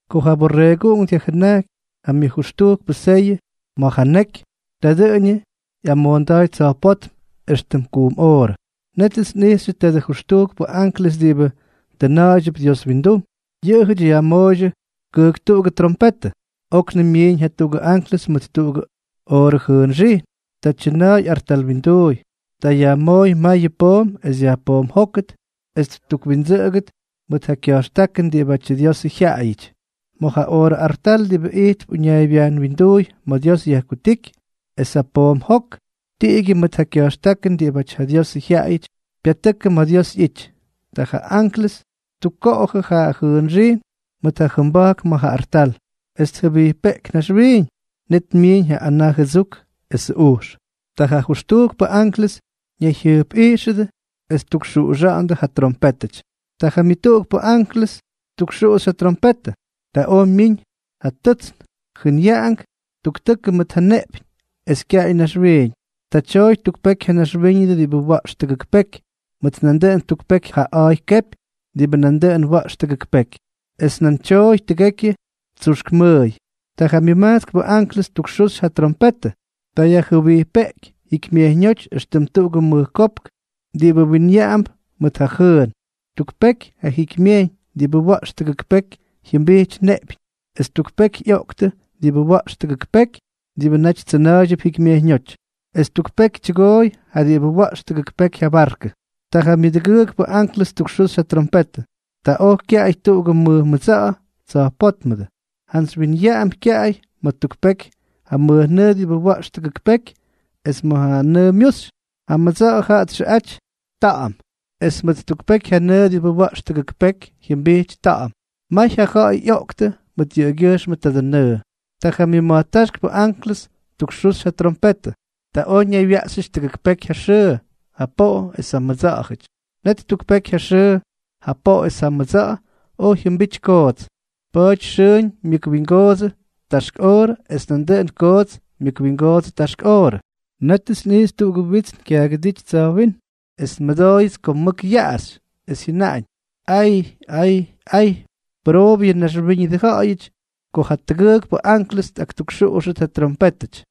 Ko ja Borreeguꞌunk dyajjʉnajky ja myʉjʉxtujkpʉ seyʉ ma̱ ja neky, ta dʉꞌʉñʉ ꞌyamoonda̱a̱y tsa̱jpótm éxtʉm kujm oorʉ. Nétʉts nꞌijxyʉ tadʉ jʉxtujkpʉ anklʉs diꞌibʉ tʉna̱a̱ydyʉp Dios windum. Yʉꞌʉjʉty yajmooydyʉ kʉjktuꞌugʉ trompetʉ. Oknʉm myiiñ jatuꞌugʉ anklʉs mʉt tuꞌugʉ oorʉ jʉʉnxijn. Ta tyʉna̱a̱y artal winduuy. Ta yajmooy mayʉ poom es yajpoomjókʉt es ttukwindsʉꞌʉgʉt mʉt ja kya̱jxtákʉn diꞌibátyʉ Diosʉ jyaꞌayʉty, ma̱ ja oorʉ artal diꞌibʉ ijtp uñaaybyajn winduuy ma̱ Dios yajkutíky. Es ja poom jok, tiꞌigyʉ mʉt ja kya̱jxtákʉn diꞌibáty ja Diosʉ jyaꞌayʉty, pyatʉkʉ ma̱ Dios ꞌyity. Ta ja anklʉs ttukkoꞌojʉ ja jʉʉnxijn mʉt ja jʉmba̱jk ma̱ ja artal, es tjʉbijpeꞌky naxwiiñ. Net myiiñ ja anaa jʉdsuk esʉ ujx. Ta ja jʉxtujkpʉ anklʉs ñayjyʉjpꞌijxʉdʉ es ttukxuꞌuxa̱ꞌa̱ndʉ ja trompétʉty. Ta ja myʉtuꞌukpʉ anklʉs ttukxuxy ja trompetʉ. Ta oj myiñ ja tʉtsn, jʉnyaꞌank tuktʉkʉ mʉt ja neꞌpyñ, es kyaꞌay naxwiiñ. Ta tyooy tuk peky ja naxwíñʉdʉ diꞌibʉ wa̱ꞌx tʉgʉk peky, mʉt nandʉꞌʉn tuk peky ja a̱a̱y kepy diꞌibʉ nandʉꞌʉn wa̱ꞌx tʉgʉk peky. Es nan tyooy tʉgekyʉ tsuxk mʉʉy. Ta ja myʉmajtskpʉ anklʉs ttukxuxy ja trompetʉ. Ta yajjʉbijpeꞌky jikymyejyñóty éxtʉm tuꞌugʉ mʉj kopk diꞌibʉ winyaꞌamp mʉt ja jʉʉn. Tuk peky ja jikymyejyñ diꞌibʉ wa̱ꞌx tʉgʉk peky jyʉmbijty neꞌpyñ. Es tuk peky ꞌyoꞌktʉ diꞌibʉ wa̱ꞌx tʉgʉk peky diꞌibʉ naty tsʉna̱a̱ydyʉp jikymyejyñóty, es tuk peky tyʉgooy ja diꞌibʉ wa̱ꞌx tʉgʉk peky ja barkʉ. Ta ja myʉdʉgʉʉkpʉ anklʉs ttukxuxy ja trompetʉ. Ta oj kyaꞌay tuꞌugʉ mʉj mʉdsa̱ꞌa̱ tsa̱jpótmʉdʉ, jantsy winyaꞌamp kyaꞌay ma̱ tuk peky ja mʉjnʉʉ diꞌibʉ wa̱ꞌx tʉgʉk peky, es ma̱ nʉʉ myuxy. Ja mʉdsa̱ꞌa̱ jaꞌa txʉꞌa̱jty Ta̱ꞌa̱m. Es tuk peky ja nʉʉ diꞌibʉ wa̱ꞌx tʉgʉk peky jyʉmbijty ta̱ꞌa̱m. May ja ja̱ꞌa̱y ꞌyoꞌktʉ mʉt yʉꞌʉgyʉjxmʉ tadʉ nʉʉ. Ta ja myʉma̱jtáxkpʉ anklʉs ttukxuxy ja trompetʉ. Ta oj ñaywyaꞌxyʉty tʉgʉk peky ja xʉʉ, ja poꞌo es ja mʉdsa̱ꞌa̱jʉty. Net tuk peky ja xʉʉ, ja poꞌo es ja mʉdsa̱ꞌa̱ oj jyʉmbity koots. Pa̱a̱ty xʉʉñ myʉkwingoodsʉ taxk oorʉ es nandʉꞌʉn koots myʉkwingoodsʉ taxk oorʉ. Nétʉts nꞌijxy tuꞌugʉ witsn kyaagʉdíty tsa̱jwínm. Es nmʉdooyʉts ko mʉk yaꞌaxy, es jyʉnaꞌañ: —¡Ay! ¡Ay! ¡Ay! Pʉroobʉ yʉ naxwíñʉdʉ ja̱ꞌa̱yʉty ko jatʉgʉʉkpʉ anklʉs tꞌaktukxuꞌuxtʉt ja trompétʉty.